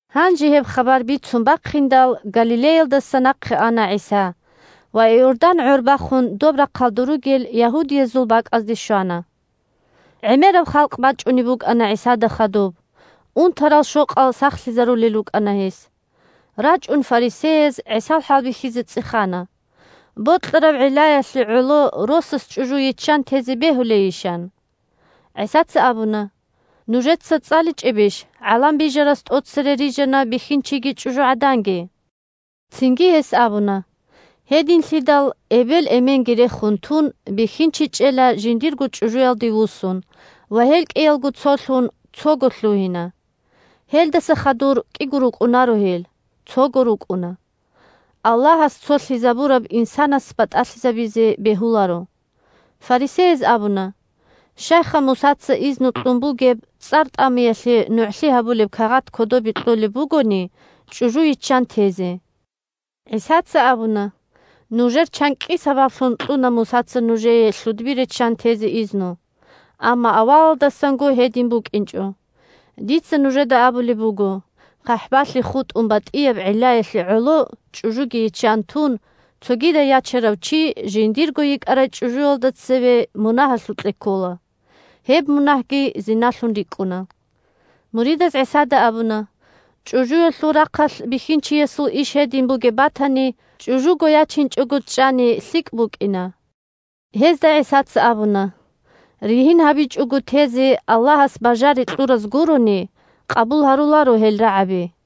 Гьанже гьеб хабар бицун бахъиндал, Галилеялдаса нахъе ана ГӀиса ва Иордан гӀор бахун доб рахъалда ругел Ягьудиялъул бакӀазде щвана. ГӀемераб халкъ бачӀунеб букӀана ГӀисада хадуб, унтарал-щокъал сахлъизарулел рукӀана гьес. РачӀун фарисеяз, ГӀисал хӀалбихьизе, цӀехана: – Бокьараб гӀиллаялъе гӀоло росас чӀужу йиччан тезе бегьулейищ? – ан. ГӀисаца абуна: – Нужеца цӀаличӀебищ: ГӀалам Бижарас тӀоцере «рижана бихьинчиги чӀужугӀаданги»? Цинги гьес абуна: «Гьединлъидал эбел-эменги рехун тун, бихьинчи чӀела жиндирго чӀужуялде вуссун, ва гьел кӀиялго цолъун, цого лъугьина» Гьелдаса хадур кӀиго рукӀунаро гьел, цого рукӀуна. Аллагьас цолъизабураб инсанас батӀалъизабизе бегьуларо. Фарисеяз абуна: – Щайха Мусаца изну кьун бугеб цӀар тӀамиялъе нугӀлъи гьабулеб кагъат кодобе кьолеб бугони, чӀужу йиччан тезе? ГӀисаца абуна: – Нужер чанкӀкӀи сабаблъун кьуна Мусаца нужее лъудби риччан тезе изну. Амма авалалдасанго гьедин букӀинчӀо. Дица нужеда абулеб буго: хъахӀбалъи хутӀун батӀияб гӀиллаялъе гӀоло чӀужуги йиччан тун, цогидай ячарав чи жиндирго йикӀарай чӀужуялда цеве мунагьалъукье ккола. Гьеб мунагьги зиналъун рикӀкӀуна. Муридаз ГӀисада абуна: – ЧӀужуялъул рахъалъ бихьинчиясул иш гьедин бугеб батани, чӀужуго ячинчӀого чӀани лъикӀ букӀина. Гьезда ГӀисаца абуна: – Ригьин гьабичӀого тезе Аллагьас бажари кьураз гурони къабул гьаруларо гьел рагӀаби.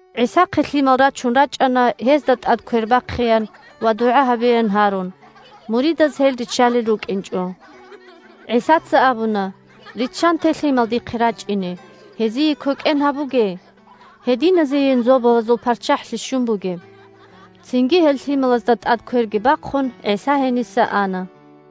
ГӀисахъе лъимал рачун рачӀана, гьезда тӀад квер бахъеян ва дугӀа гьабеян гьарун. Муридаз гьел риччалел рукӀинчӀо. ГӀисаца абуна: – Риччанте лъимал дихъе рачӀине, гьезие квекӀен гьабуге. Гьединазейин Зобалазул ПарччахӀлъи щун бугеб! Цинги, гьел лъималазда тӀад кверги бахъун, ГӀиса гьениса ана.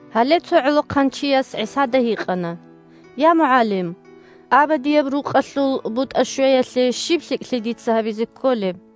Гьале цо гӀолохъанчияс ГӀисада гьикъана: – Я, МугӀалим! Абадияб рукъалъул бутӀа щвеялъе щиб лъикӀлъи дица гьабизе кколеб?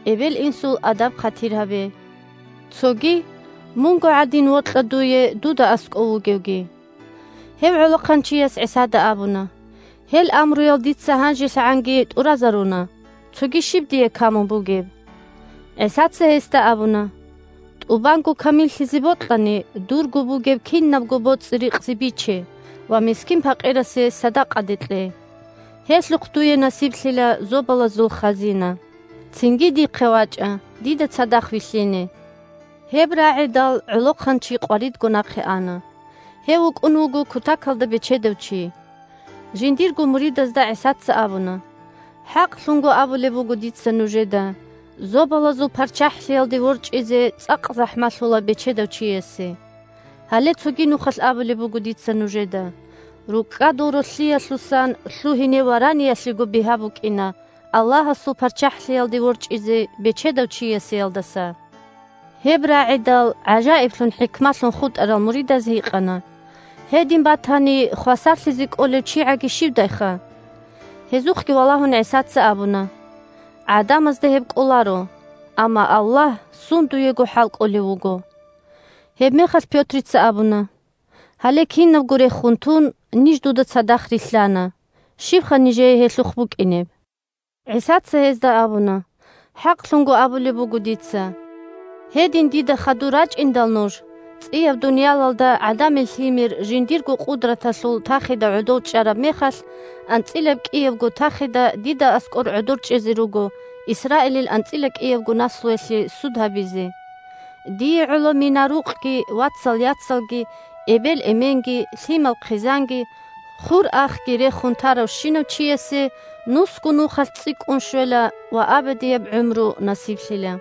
«эбел-инсул адаб-хъатир гьабе». Цоги: «мунго гӀадин вокьа дуе дуда аскӀов вугевги». Гьев гӀолохъанчияс ГӀисада абуна: – Гьел амруял дица гьанжелъагӀанги тӀуразаруна. Цоги щиб дие камун бугеб? ГӀисаца гьесда абуна: – ТӀубанго камиллъизе бокьани, дурго бугеб кинабго боцӀи-рикъзи биче ва мискин-пакъирасе садакъаде кье. Гьелъухъ дуе насиблъила зобалазул хазина. Цинги дихъе вачӀа, дида цадахъ вилълъине. Гьеб рагӀидал, гӀолохъанчи къваридго нахъе ана. Гьев вукӀун вуго кутакалда бечедав чи. Жиндирго муридазда ГӀисаца абуна: – ХӀакълъун абулеб буго дица нужеда: Зобалазул ПарччахӀлъиялде ворчӀизе цӀакъ захӀмалъула бечедав чиясе. Гьале цоги нухалъ абулеб буго дица нужеда: рукӀкӀадул ролъиялъусан лъугьине вараниялъего бигьа букӀина Аллагьасул ПарччахӀлъиялде ворчӀизе бечедав чиясеялдаса. Гьеб рагӀидал, гӀажаиблъун-хӀикмалъун хутӀарал муридаз гьикъана: – Гьедин батани, хвасарлъизе кӀолев чигӀаги щивдайха? Гьезухъги валагьун, ГӀисаца абуна: – ГӀадамазда гьеб кӀоларо, амма Аллагь сундуего хӀалкӀолев вуго. Гьебмехалъ Пётрица абуна: – Гьале, кинабго рехун тун, ниж дуда цадахъ рилълъана. Щибха нижее гьелъухъ букӀинеб? ГӀисаца гьезда абуна: – ХӀакълъун абулеб буго дица: гьедин дида хадур рачӀиндал нуж, цӀияб дуниялалда ГӀадамил Лъимер жиндирго къудраталъул тахида гӀодов чӀараб мехалъ, анцӀила кӀиябго тахида дида аскӀор гӀодор чӀезе руго. Исраилил анцӀила кӀиябго наслуялъе суд гьабизе. Дие гӀоло мина-рукъги, вацал-яцалги, эбел-эменги, лъимал-хъизанги, хур-ахги рехун таравщинав чиясе нусго нухалъ цӀикӀкӀун щвела ва абадияб гӀумру насиблъила.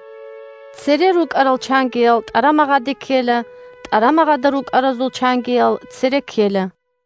Цере рукӀарал чангиял тӀарамагъаде ккела, тӀарамагъада рукӀаразул чангиял цере ккела.